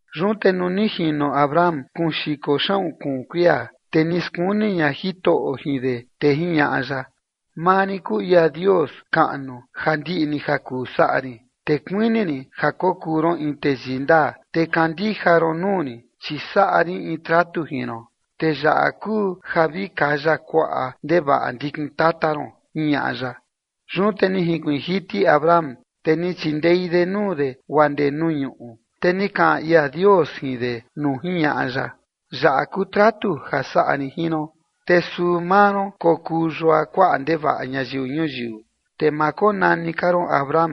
Yun te nuu ni jino Abram kuun xiko xaꞌun kuun kuia, te ni skuni ña Jitoꞌo jin de, te jiñaꞌa ya: ―Maa rin kuu ia Dios kaꞌnu ja ndiꞌi ni ja kuu saꞌa rin, te kuini rin ja kokuu ron in teyii ndaa, te kandija ron nuu rin. Chi saꞌa rin in tratu jin ron, te yaꞌa kuu ja vi kaya kuaꞌa ndevaꞌa ndikin tata ron ―jiñaꞌa ya. Yun te ni jinkuiin jiti Abram, te ni chindei de nuu de guaa ndee nuu ñuꞌu, te ni kaꞌan ia Dios jin de nuu jiñaꞌa ya: ―Yaꞌa kuu tratu ja saꞌa rin jin ron: Te suu maa ron kokuu yua kuaꞌa ndevaꞌa ñayiu ñuyiu. Te ma konani ka ron Abram,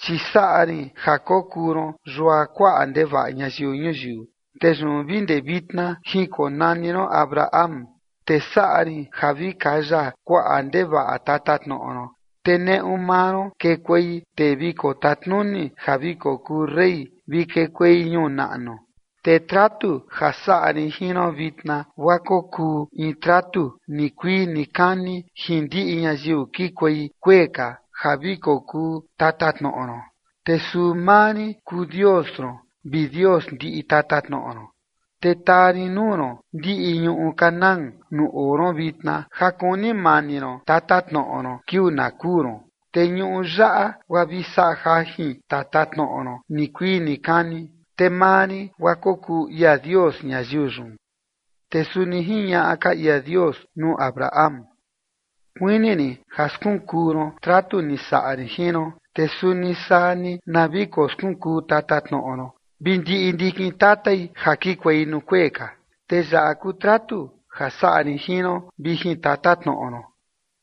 chi saꞌa rin ja kokuu ron yua kuaꞌa ndevaꞌa ñayiu ñuyiu, te yun vi ndee vitna jinkonani ron Abraham. Te saꞌa rin ja vi kaya kuaꞌa ndevaꞌa tatatnoꞌo ron, te neꞌu maa ron kekuei tee vi kotatnuni ja vi kokuu rey vi kekuei ñuu naꞌnu. Te tratu ja saꞌa rin jin ron vitna guaa kokuu in tratu nikuii nikani jin ndiꞌi ñayiu kikuei kuee ka ja vi kokuu tatatnoꞌo ron, te suu maa rin kuu Dios ron vi Dios ndiꞌi tatatnoꞌo ron. Te taa rin nuu ron ndiꞌi ñuꞌu Canaán nuu oo ron vitna ja kuni mani ron tatatnoꞌo ron kiuu na kuu ron, te ñuꞌu yaꞌa guaa vi saꞌa jajin tatatnoꞌo ron nikuii nikani, te maa rin guaa kokuu ia Dios ñayiu yun. Te suni jiñaꞌa ka ia Dios nuu Abraham: ―Kuini rin ja skunkuu ron tratu ni saꞌa rin jin ron, te suni saa ni na vi koskunkuu tatatnoꞌo ron vi ndiꞌi ndikin tatai ja kikuei nuu kuee ka. Te yaꞌa kuu tratu ja saꞌa rin jin ron vi jin tatatnoꞌo ron: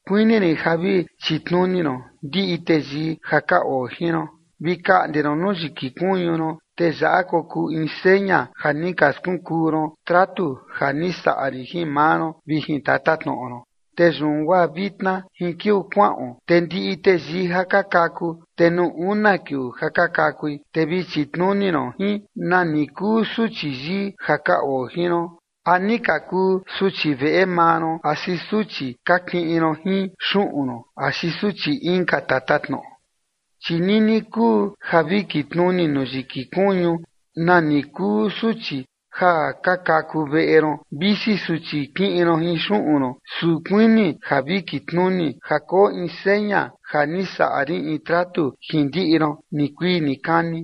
kuini rin ja vi chitnuni ron ndiꞌi teyii ja ka oo jin ron. Vi kaꞌnde nuu yiki kuñu ron, te yaꞌa kokuu in seña ja ni ka skunkuu ron tratu ja ni saꞌa rin jin maa ron vi jin tatatnoꞌo ron. Te yun guaa vitna jin kiuu kuaꞌon, te ndiꞌi teyii ja ka kaku, te nuu una kiuu ja ka kakui, te vi chitnuni ron jin, nani kuu suchi yii ja ka oo jin ron, a ni ka kuu suchi veꞌe maa ron axi suchi ka kiꞌin ron jin xuꞌun ron axi suchi inka tatatnoꞌo. Chi nini kuu ja vi kitnuni nuu yiki kuñu nani kuu suchi ja ka kaku veꞌe ron, visi suchi kiꞌin ron jin xuꞌun ron, su kuini ja vi kitnuni ja koo in seña ja ni saꞌa rin in tratu jin ndiꞌi ron nikuii nikani.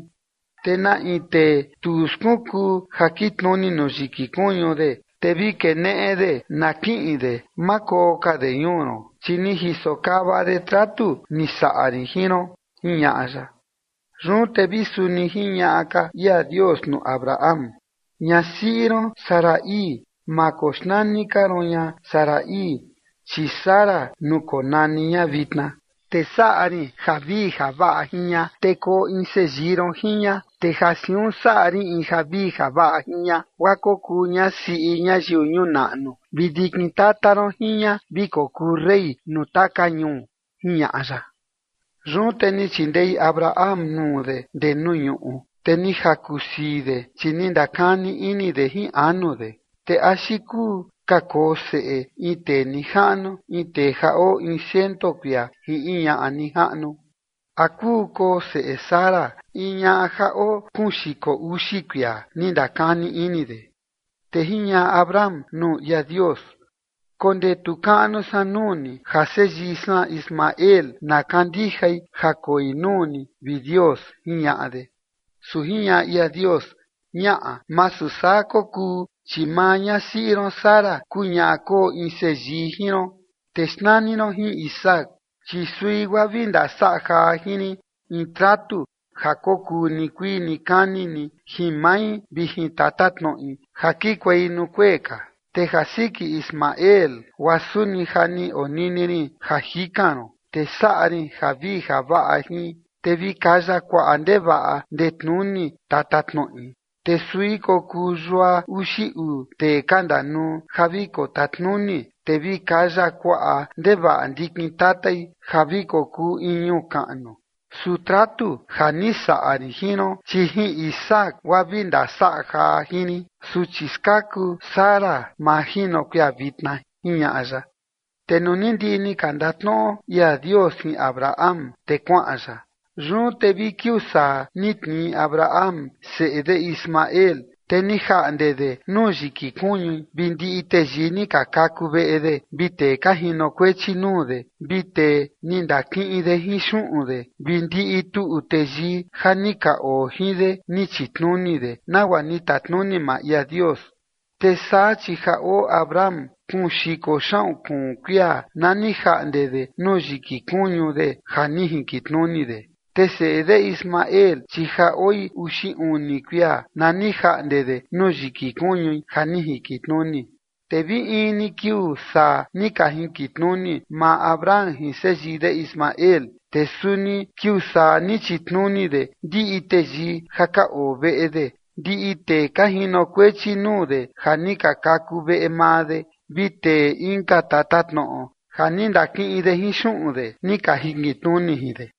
Te na in tee tu skunkuu ja kitnuni nuu yiki kuñu de, te vi keneꞌe de na kiꞌin de, ma koo ka de ñuu ron, chi ni jisokava de tratu ni saꞌa rin jin ron ―jiñaꞌa ya. Yun te vi suni jiñaꞌa ka ia Dios nuu Abraham: ―Ñasiꞌi ron Sarai ma koxnani ka ron ña Sarai, chi Sara nuu konani ña vitna. Te saꞌa rin javii javaꞌa jin ña, te koo in seyii ron jin ña, te ja siun saꞌa rin in javii javaꞌa jin ña guaa kokuu ña siꞌi ñayiu ñuu naꞌnu vi ndikin tata ron jin ña vi kokuu rey nuu taka ñuu ―jiñaꞌa ya. Yun te ni chindei Abraham nuu de ndee nuu ñuꞌu, te ni jaku sii de, chi ni ndakani ini de jin anu de: ―¿Te axi kuu ka koo seꞌe in tee nijaꞌnu in tee ja oo in ciento kuia jin in ñaꞌa nijaꞌnu? ¿A kuu koo seꞌe Sara, in ñaꞌa ja oo kuun xiko uxi kuia? ―ni ndakani ini de. Te jiñaꞌa Abraham nuu ia Dios: ―Kondetu kaꞌnu san nuu ni ja seyii san Ismael na kandijai ja koi nuu ni, vi Dios ―jiñaꞌa de. Su jiñaꞌa ia Dios: ―Ñaꞌa, masu saa kokuu, chi maa ñasiꞌi ron Sara kuu ñaꞌa koo in seyii jin ron, te xnani ron jin Isaac, chi sui guaa vi ndasaꞌa jaa jin rin in tratu ja kokuu nikuii nikani ni jin mai vi jin tatatnoꞌi ja kikuei nuu kuee ka. Te ja siki Ismael, guaa suni ja ni onini rin ja jikan ron, te saꞌa rin javii javaꞌa jin, te vi kaya kuaꞌa ndevaꞌa ndetnuni tatatnoꞌi, te sui kokuu yua uxi uu tee ka ndanuu ja vi kotatnuni, te vi kaya kuaꞌa ndevaꞌa ndikin tatai ja vi kokuu in ñuu kaꞌnu. Su tratu ja ni saꞌa rin jin ron, chi jin Isaac guaa vi ndasaꞌa jaa jin rin, suchi skaku Sara majino kuia vitna ―jiñaꞌa ya. Te nuu ni ndiꞌi ni ka ndatnoꞌo ia Dios jin Abraham, te kuaꞌan ya. Yun te vi kiuu saa ni tnii Abraham seꞌe de Ismael, te ni jaꞌnde de nuu yiki kuñui vi ndiꞌi teyii ni ka kaku veꞌe de vi tee ka jinokuechi nuu de vi tee ni ndakiꞌin de jin xuꞌun de vi ndiꞌi tuꞌu teyii ja ni ka oo jin de ni chitnuni de nagua ni tatnuni maa ia Dios. Te saa chi ja oo Abraham kuun xiko xaꞌun kuun kuia na ni jaꞌnde de nuu yiki kuñu de ja ni jinkitnuni de. Te seꞌe de Ismael, chi ja oi uxi uni kuia na ni jaꞌnde de nuu yiki kuñui ja ni jinkitnuni. Te vi in ni kiuu saa ni ka jinkitnuni maa Abraham jin seyii de Ismael. Te suni kiuu saa ni chitnuni de ndiꞌi teyii ja ka oo veꞌe de, ndiꞌi tee ka jinokuechi nuu de ja ni ka kaku veꞌe maa de vi tee inka tatatnoꞌo ja ni ndakiꞌin de jin xuꞌun de ni ka jinkitnuni jin de.